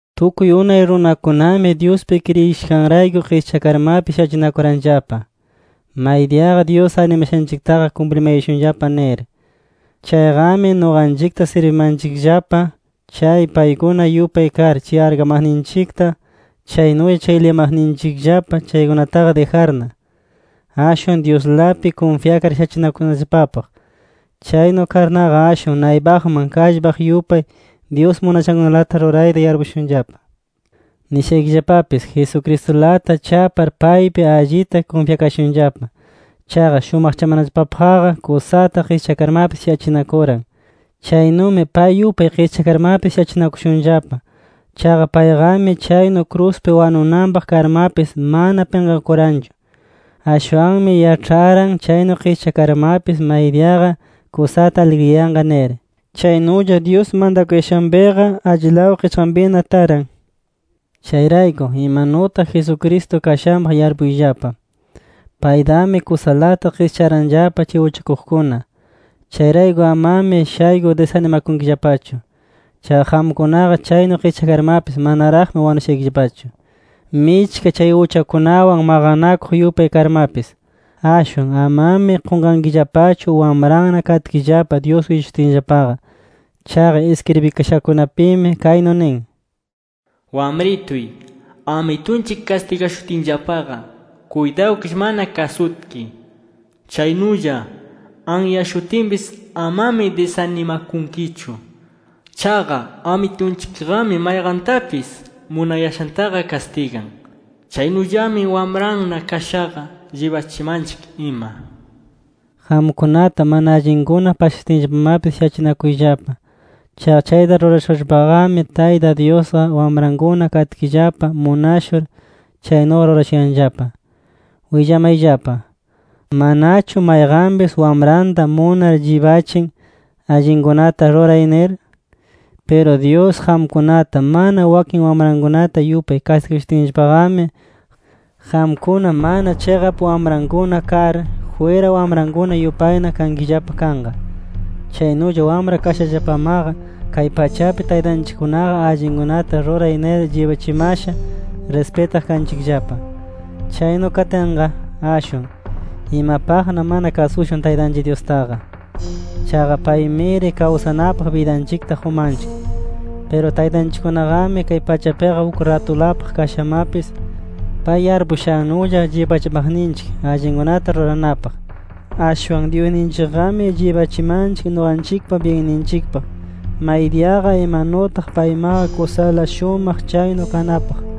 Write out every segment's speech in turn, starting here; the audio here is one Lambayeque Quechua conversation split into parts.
Tukuy unay runakunami Dyuspi kriyishanrayku qischakarmapis shachinakuranllapa, maydiyaqa Dyus arnimashanchiktaqa kumplimayashunllapa nir. Chayqami nuqanchikta sirbimanchikllapa, chay paykuna yupay kar chay arkamaqninchikta, chaynulla chay liyamaqninchikllapa chaykunataqa dijarna, ashwan Dyuslapi kunfyakar shachinakunallapapaq. Chaynu karnaqa, ashwan naypaqman kallpaq yupay, Dyus munashankunalata rurayta yarpushunllapa. Nishaykillapapis, Jesucristulata chapar paypi allita kunfyakashunllapa. Chaqa shumaqchamanallapapaqqa kusata qischakarmapis shachinakuran. Chaynumi pay yupay qischakarmapis shachinakushunllapa. Chaqa payqami chaynu kruspi wanunanpaq karmapis mana pinqakuranchu. Ashwanmi yaĉharan chaynu qischakayarmapis, maydiyaqa kusata aligriyanqa nir. Chaynulla Dyus mantakuyashanpiqa, allilaw qichqanpina taran. Chayrayku, imanutaq Jesucristo kashanpaq yarpuyllapa. Paytami kusalata qischaranllapa chay uchakuqkuna. Chayrayku amami shaykur disanimakunkillapachu. Chaqa qamkunaqa chaynu qischakarmapis manaraqmi wanushaykillapachu, michka chay uchakunawan maqanakuq yupay karmapis. Ashwan amami qunqankillapachu wamranna katkillapa Dyus willashutinllapaqa. Chaqa iskribikashakunapimi kaynu nin: “Wamrituy, Amitunchik kastigashutinllapaqa kuytawkish mana kasutki. Chaynulla anyashutinpis, amami disanimakunkichu. Chaqa Amitunchikqami mayqantapis munayashantaqa kastigan. Chaynullami wamranna kashaqa, llibachimanchik ima” nir. Qamkunata mana allinkuna pasashutinllapamapis shachinakuyllapa. Chaqa chayta rurashurllapaqami, Tayta Dyusqa wamrankuna katkillapa munashur chaynuqa rurashuyanllapa. Willamayllapa: ¿Manachu mayqanpis wamranta munar llibachin allinkunata ruray nir? Piru Dyus qamkunata mana wakin wamrankunata yupay kastigashutinllapaqami, qamkuna mana chiqap wamrankuna kar, jwira wamrankuna yupayna kankillapa kanqa. Chaynulla wamra kashallapamaqa, kay pachapi taytanchikkunaqa allinkunata ruray nir llibachimasha rispitaq kanchikllapa. Chaynu katinqa, ashwan ¿imapaqna mana kasushun Taytanchik Dyustaqa? Chaqa paymiri kawsanapaq bidanchikta qumanchik. Piru taytanchikkunaqami kay pachapiqa uk ratulapaq kashamapis, pay yarpushannulla llibachimaqninchik allinkunata ruranapaq. Ashwan Dyusninchikqami llibachimanchik nuqanchikpa byinninchikpaq, maydiyaqa imanutaq paymaqa kusala shumaq chaynu kanapaq.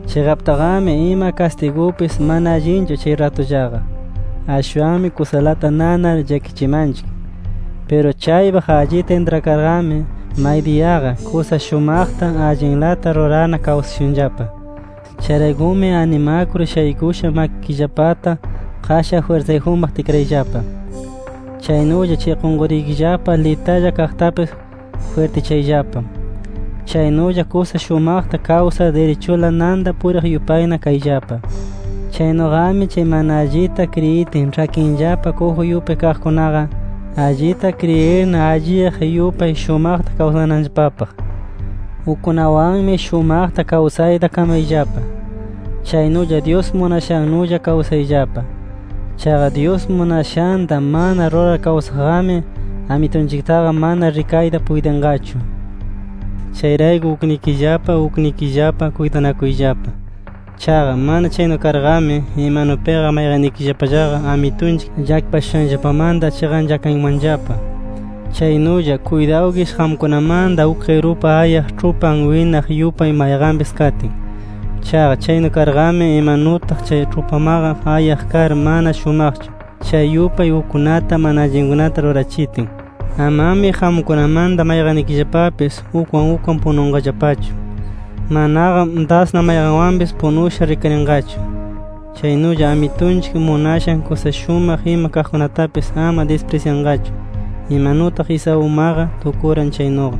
Chiqaptaqami ima kastigupis mana allinchu chay ratullaqa. Ashwanmi kusalata nanar llakichimanchik. Piru chaypaq allita intrakarqami, maydiyaqa kusa shumaqta, allinlata rurarna kawsashunllapa. Chayraykumi animakur shaykusha makikillapata, qashan jwirsayjunpaq tikrayllapa. Chaynulla chay qunqurikillapa litalla kaqtapis jwirtichayllapa. Chaynulla kusa shumaqta kawsar, dirichula nanta puriq yupayna kayllapa. Chaynuqami chay mana allita kriyitin, ĉhakinllapa kuju yupay kaqkunaqa, allita kriyirna alliyaq yupay shumaqta kawsananllapapaq. Ukkunawanmi shumaqta kawsayta kamayllapa. Chaynulla Dyus munashannulla kawsayllapa. Chaqa Dyus munashanta mana rurar kawsaqqami, Amitunchiktaqa mana rikayta puytinqachu. Chayrayku uknikillapa uknikillapa kuytanakuyllapa. Chaqa mana chaynu karqami, imanupiqa mayqannikillapallaqa Amitunchik llakipashushanllapamanta chiqanchakankimanllapa. Chaynulla, kuytawkish qamkunamanta uk qirupa ayaq ĉhupan winaq yupay mayqanpis katin. Chaqa chaynu karqami, imanutaq chay ĉhupamaqa ayaq kar mana shumaqchu, chay yupay ukkunata mana allinkunata rurachitin. Amami qamkunamanta mayqannikillapapis ukwan ukwan pununqallapachu, manaqa dasna mayqanwanpis punusha rikarinqachu. Chaynulla Amitunchik munashan kusa shumaq ima kaqkunatapis ama disprisyanqachu, imanutaq Esaumaqa tukuran chaynuqa.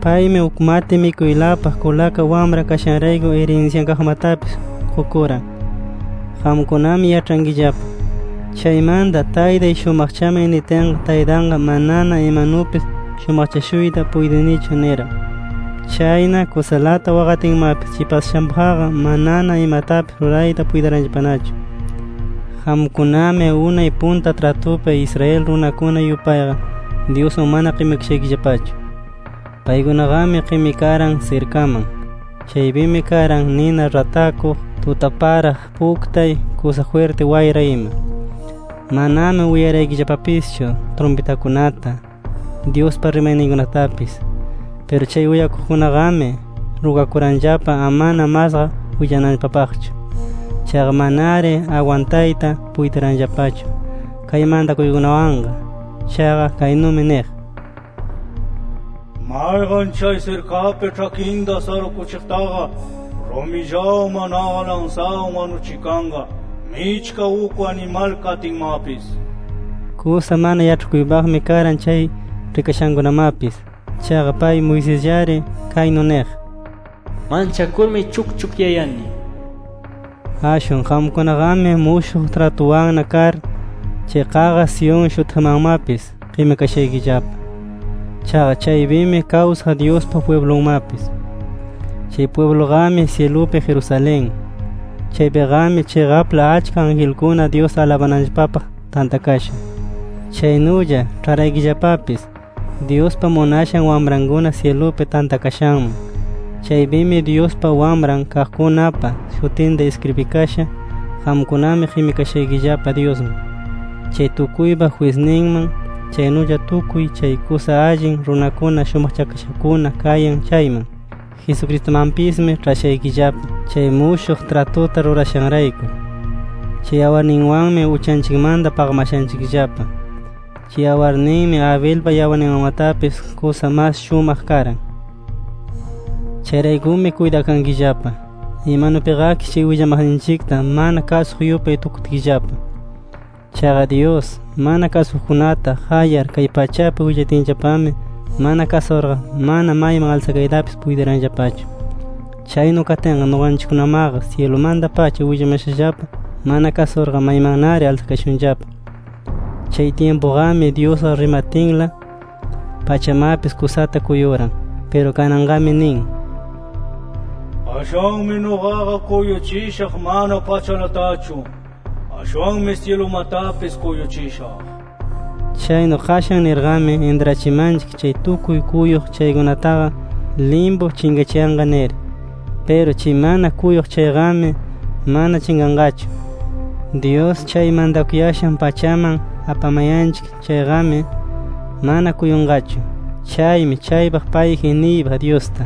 Paymi uk mati mikuylapaq kulaka wamra kashanrayku irinsyan kaqmatapis qukuran. Qamkunami yaĉhankillapa, “Chaymanta taytay shumaqchamay” nitinqa, taytanqa “Manana imanupis shumaqchashuyta puytinichu” niran. Chayna kusalata waqatinmapis, chay pasashanpaqqa manana imatapis rurayta puytiranllapanachu. Qamkunami unay punta tratupi Israel runakuna yupayqa, Dyusman mana qimikashaykillapachu. Paykunaqami qimikaran sirkaman. Chaypimi karan nina ratakuq, tutaparaq, puktay, kusa jwirti wayra ima. Manami uyaraykillapapischu trumpitakunata, Dyuspa rimayninkunatapis. Piru chay uyaqkunaqami, rugakuranllapa amana masqa willananllapapaqchu. Chaqa manari agwantayta puytiranllapachu kay mantakuykunawanqa. Chaqa kaynumi niq: “Mayqan chay sirkapi ĉhakinta sarukuchiqtaqa, rumillawan, manaqa lansawan, wanuchikanqa michka uk animal katinmapis” nir. Kusa mana yaĉhakuypaqmi karan chay rikashankunamapis. Chaqa pay Moisesllari kaynu niq: “Manchakurmi chukchukyayani” nir. Ashwan qamkunaqami, mushuq tratuwanna kar, chay qaqa Sión shutiqmanmapis qimikashaykillapa. Chaqa chaypimi kawsaq Dyuspa pwiblunmapis. Chay pwibluqami syilupi Jerusalén. Chaypiqami chiqapla achka angelkuna Dyusta alabananllapapaq tantakasha. Chaynulla ĉharaykillapapis Dyuspa munashan wamrankuna syilupi tantakashanman. Chaypimi Dyuspa wamran kaqkunapa shutinqa iskribikasha. Qamkunami qimikashaykillapa Dyusman, chay tukuypa jwisninman, chaynulla tukuy chay kusa allin runakuna shumaqchakashakuna kayan chayman. Jesucristumanpismi ĉhashaykillapa, chay mushuq tratuta rurashanrayku. Chay yawarninwanmi uchanchikmanta paqamashanchikllapa. Chay yawarninmi, Abelpa yawarninmanmatapis kusa mas shumaq karan. Chayraykumi kuytakankillapa. Imanupiqakish chay willamaqninchikta mana kasuq yupay tukutkillapa. Chaqa Dyus, mana kasukuqkunata qayar kay pachapi willatinllapami mana kasurqa, mana mayman alsakaytapis puytiranllapachu. Chaynu katinqa nuqanchikkunamaqa syilumanta-pacha willamashallapa mana kasurqa, maymannari alsakashunllapa. Chay tyimpuqami, Dyusqa rimatinla pachamapis kusata kuyuran. Piru kananqami nin: “Qashanmi nuqaqa kuyuchishaq mana pachalatachu. Ashwanmi syilumatapis kuyuchishaq” nir. Chaynu “Qashan” nirqami, intrachimanchik chay tukuy kuyuq chaykunataqa, limpu chinqachiyanqa nir. Piru chay mana kuyuq chayqami, mana chinqanqachu. Dyus chay mantakuyashan pachaman apamayanchik chayqami, mana kuyunqachu. Chaymi chaypaq payji niypaq Dyusta.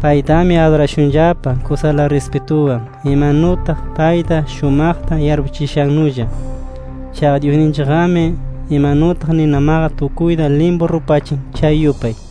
Paytami adurashunllapa kusala rispituwan, imanutaq payta shumaqta yarpuchishannulla. Chaqa Dyusninchikqami, imanutaq ninamaqa tukuyta limpu rupachin chay yupay.